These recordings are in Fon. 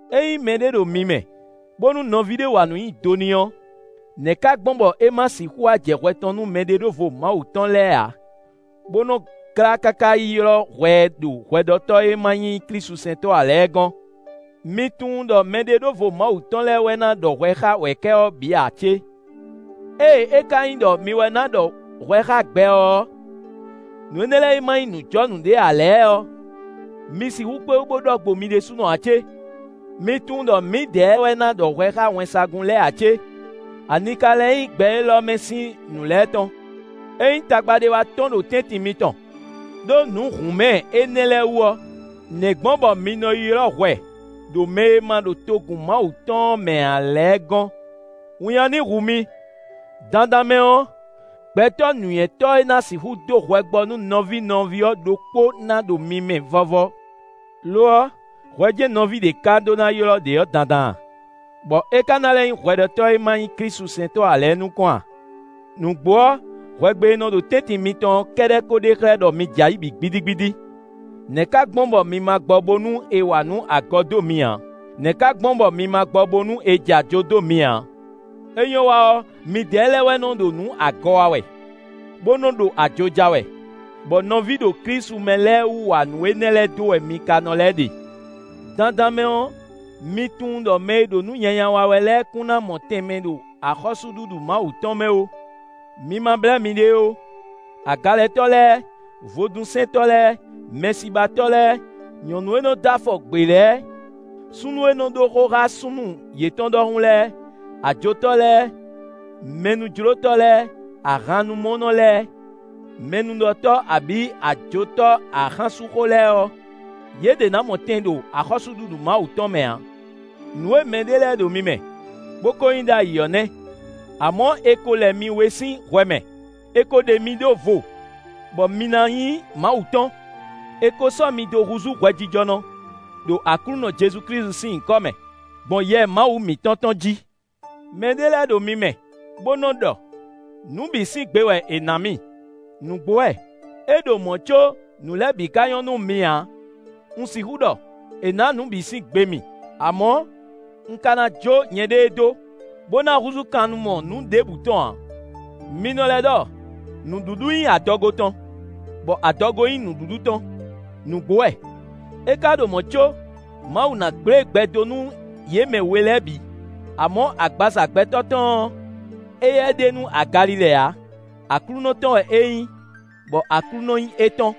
Ényí mɛɖé ɖo mi mɛ, bónú nɔví ɖé wa nǔ nyi do n'i ɔ́, nɛ̌ ka gbɔn bɔ é ma sixú wá jɛ hwɛ tɔn nú mɛɖeɖóvo Mawu tɔn lɛ́ɛ ǎ, bó nɔ́ glá káká yi ylɔ́ hwɛ ɛ ɖo hwɛɖɔtɔ́ e ma nyí klísusɛntɔ́ ǎ lɛ́ɛ gɔ́n? Mi tunwun ɖɔ mɛɖeɖóvo Mawu tɔn lɛ́ɛ wɛ ná ɖɔ hwɛ xá wɛ̌kɛ́ ɔ́ bǐ ǎ cé? Ée é ka nyí ɖɔ mi wɛ ɖó ná ɖɔ hwɛ xá gbɛ ɔ́, nǔ énɛ́ lɛ́ɛ e ma nyí nǔjɔnǔ ɖé ǎ lɛ́ɛ ɔ́, mi sixú kpé wú bó ɖɔ gbo mi ɖésúnɔ ǎ cé? Mi tunwun ɖɔ mǐdɛɛ wɛ ná ɖɔ hwɛ xá wɛnsagun lɛ́ɛ ǎ cé? Ani ka lɛ́ nyí gbɛ élɔ́ mɛ sín nǔ lɛ́ɛ tɔn? Ényí tagba ɖé wá tɔ́n ɖo tɛ́ntin mitɔn, ɖó nǔ hǔnmɛ énɛ́ lɛ́ɛ wú ɔ́, nɛ̌ gbɔn bɔ mi nɔ yi ylɔ́ hwɛ ɖo mɛ e ma ɖo togun Mawu tɔn ɔ́ mɛ ǎ lɛ́ɛ gɔ́n? Winnyá ní hu mi. Dandan mɛ ɔ́, gbɛtɔ́ nǔnywɛ́tɔ́ e ná sixú dó hwɛ gbɔ nú nɔví nɔví ɔ́ ɖokpó ná ɖo mi mɛ vɔ́vɔ́! Lo ɔ́, hwɛ jɛ́n nɔví ɖě ká ɖó ná ylɔ́ ɖě ɔ́ dandan a? Bɔ é ka ná lɛ́ nyí hwɛɖɔtɔ́ e ma nyí klísusɛntɔ́ ǎ lɛ́ɛ nukɔn a? Nǔgbó ɔ́, hwɛgbe e nɔ ɖo tɛ́ntin mitɔn ɔ́ kɛ́ɖɛ́ ko ɖe xlɛ́ ɖɔ mi jɛ ayǐ bǐ gbídígbídí. Nɛ̌ ka gbɔn bɔ mi ma gbɔ bónú è wa nǔ agɔ dó mi ǎ? Nɛ̌ ka gbɔn bɔ mi ma gbɔ bónú è jɛ ajo dó mi ǎ? É nyɔ́ wa ɔ́, midɛɛ lɛ́ɛ wɛ nɔ ɖo nǔ agɔ wa wɛ, bó nɔ́ ɖo ajo ja wɛ, bɔ nɔví ɖo Klísu mɛ lɛ́ɛ wú wa nǔ énɛ́ lɛ́ɛ dó wɛ mi ka nɔ lɛ́ ɖe! Dandan mɛ ɔ́, mi tunwun ɖɔ mɛ e ɖo nǔ nyanya wa wɛ lɛ́ɛ kún ná mɔ tɛn ɖo axɔ́súɖuɖu Mawu tɔn mɛ ó; mi ma blɛ́ miɖée ó: agalɛtɔ́ lɛ́ɛ, vodúnsɛntɔ́ lɛ́ɛ, mɛsibatɔ́ lɛ́ɛ, nyɔ̌nu e nɔ dó afɔ gbě lɛ́ɛ, súnnu e nɔ ɖó xó xá súnnu yětɔn ɖɔhun lɛ́ɛ, ajotɔ́ lɛ́ɛ, mɛnújlótɔ́ lɛ́ɛ, ahannumúnɔ lɛ́ɛ, mɛnúɖɔtɔ́ abǐ ajotɔ́ axánsúnxó lɛ́ɛ ɔ́, yě ɖě ná mɔ tɛn ɖo axɔ́súɖuɖu Mawu tɔn mɛ ǎ. Nǔ e mɛɖé lɛ́ɛ ɖo mi mɛ, bó ko nyí ɖ'ayǐ ɔ́ nɛ́. Amɔ̌, è ko lɛ mi wé sín hwɛ mɛ; è ko ɖe mi ɖó vo, bɔ mi na nyí Mawu tɔn; è ko sɔ́ mi dó húzú hwɛjijɔnɔ, ɖo Aklúnɔ Jezu Klísu sín nyǐkɔ mɛ, gbɔn Yɛ Mawu mǐtɔn tɔn jí. Mɛ ɖé lɛ́ɛ ɖo mi mɛ, bó nɔ ɖɔ: “Nǔ bǐ sín gbe wɛ è nǎ mì.” Nǔgbó wɛ! É ɖo mɔ̌ có nǔ lɛ́ɛ bǐ ka nyɔ́ nú mi ǎ. Un sixú ɖɔ: “È nǎ nǔ bǐ sín gbe mì”; amɔ̌, un ka ná jó nyɛɖée dó, bó na húzú kannumɔ nǔ ɖěbǔ tɔn ǎ. Mi nɔ lɛ́ ɖɔ: “Nǔɖuɖu nyí adɔgo tɔn, bɔ adɔgo nyí nǔɖuɖu tɔn.” Nǔgbó wɛ! É ka ɖo mɔ̌ có Mawu ná gblé gbɛ dó nú yě mɛ we lɛ́ɛ bǐ. Amɔ̌ agbaza gbɛtɔ́ tɔn ɔ́, éyɛ́ ɖe nú agalilɛ ǎ: Aklúnɔ tɔn wɛ é nyí, bɔ Aklúnɔ nyí étɔn.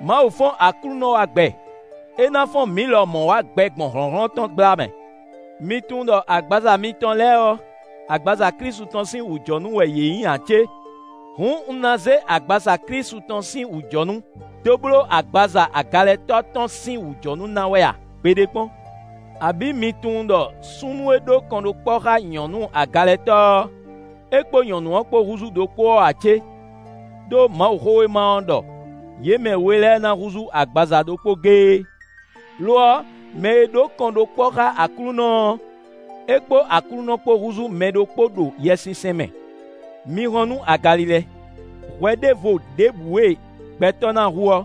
Mawu fɔ́n Aklúnɔ wá gbɛ: é ná fɔ́n mǐ lɔmɔ̌ wá gbɛ gbɔn hlɔ̌nhlɔ́n tɔn gbla mɛ. Mi tunwun ɖɔ agbaza mitɔn lɛ́ɛ ɔ́, agbaza Klísu tɔn sín wǔjɔnú wɛ yě nyí ǎ cé? Hǔn un ná zé agbaza Klísu tɔn sín wǔjɔnú dó bló agbaza agalɛtɔ́ tɔn sín wǔjɔnú ná wɛ a? Gbeɖé kpɔ́n! Abǐ mi tunwun ɖɔ súnnu e ɖó kɔnɖókpɔ́ xá nyɔ̌nu agalɛtɔ́ ɔ́, é kpó nyɔ̌nu ɔ́ kpó húzú ɖokpó ɔ́ ǎ cé? Đó Mawuxówéma ɔ́ ɖɔ: “Yě mɛ we lɛ́ɛ ná húzú agbaza ɖokpó géé.” Lo ɔ́, mɛ e ɖó kɔnɖókpɔ́ xá Aklúnɔ ɔ́, é kpó Aklúnɔ kpó húzú mɛ ɖokpó ɖo Yɛsinsɛn mɛ. Mi hɔn nú agalilɛ. Hwɛ ɖěvo ɖěbǔ e gbɛtɔ́ ná hu ɔ́,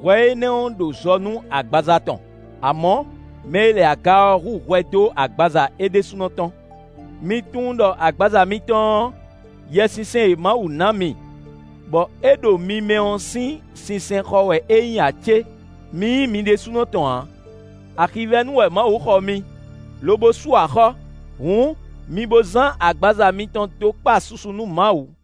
hwɛ énɛ́ ɔ́ ɖo zɔ nú agbaza tɔn; amɔ̌, mɛ e lɛ aga ɔ́ hu hwɛ dó agbaza é ɖésúnɔ tɔn. Mi tunwun ɖɔ agbaza mitɔn ɔ́, Yɛsinsɛn e Mawu ná mi, bɔ é ɖo mi mɛ ɔ́ sín sinsɛnxɔ wɛ é nyí ǎ cé? Mi nyí mi ɖésúnɔ tɔn ǎ: axivɛ́nu wɛ Mawu xɔ mi, lobo sú axɔ́. Hǔn, mi bo zán agbaza mitɔn dó kpa susu nú Mawu.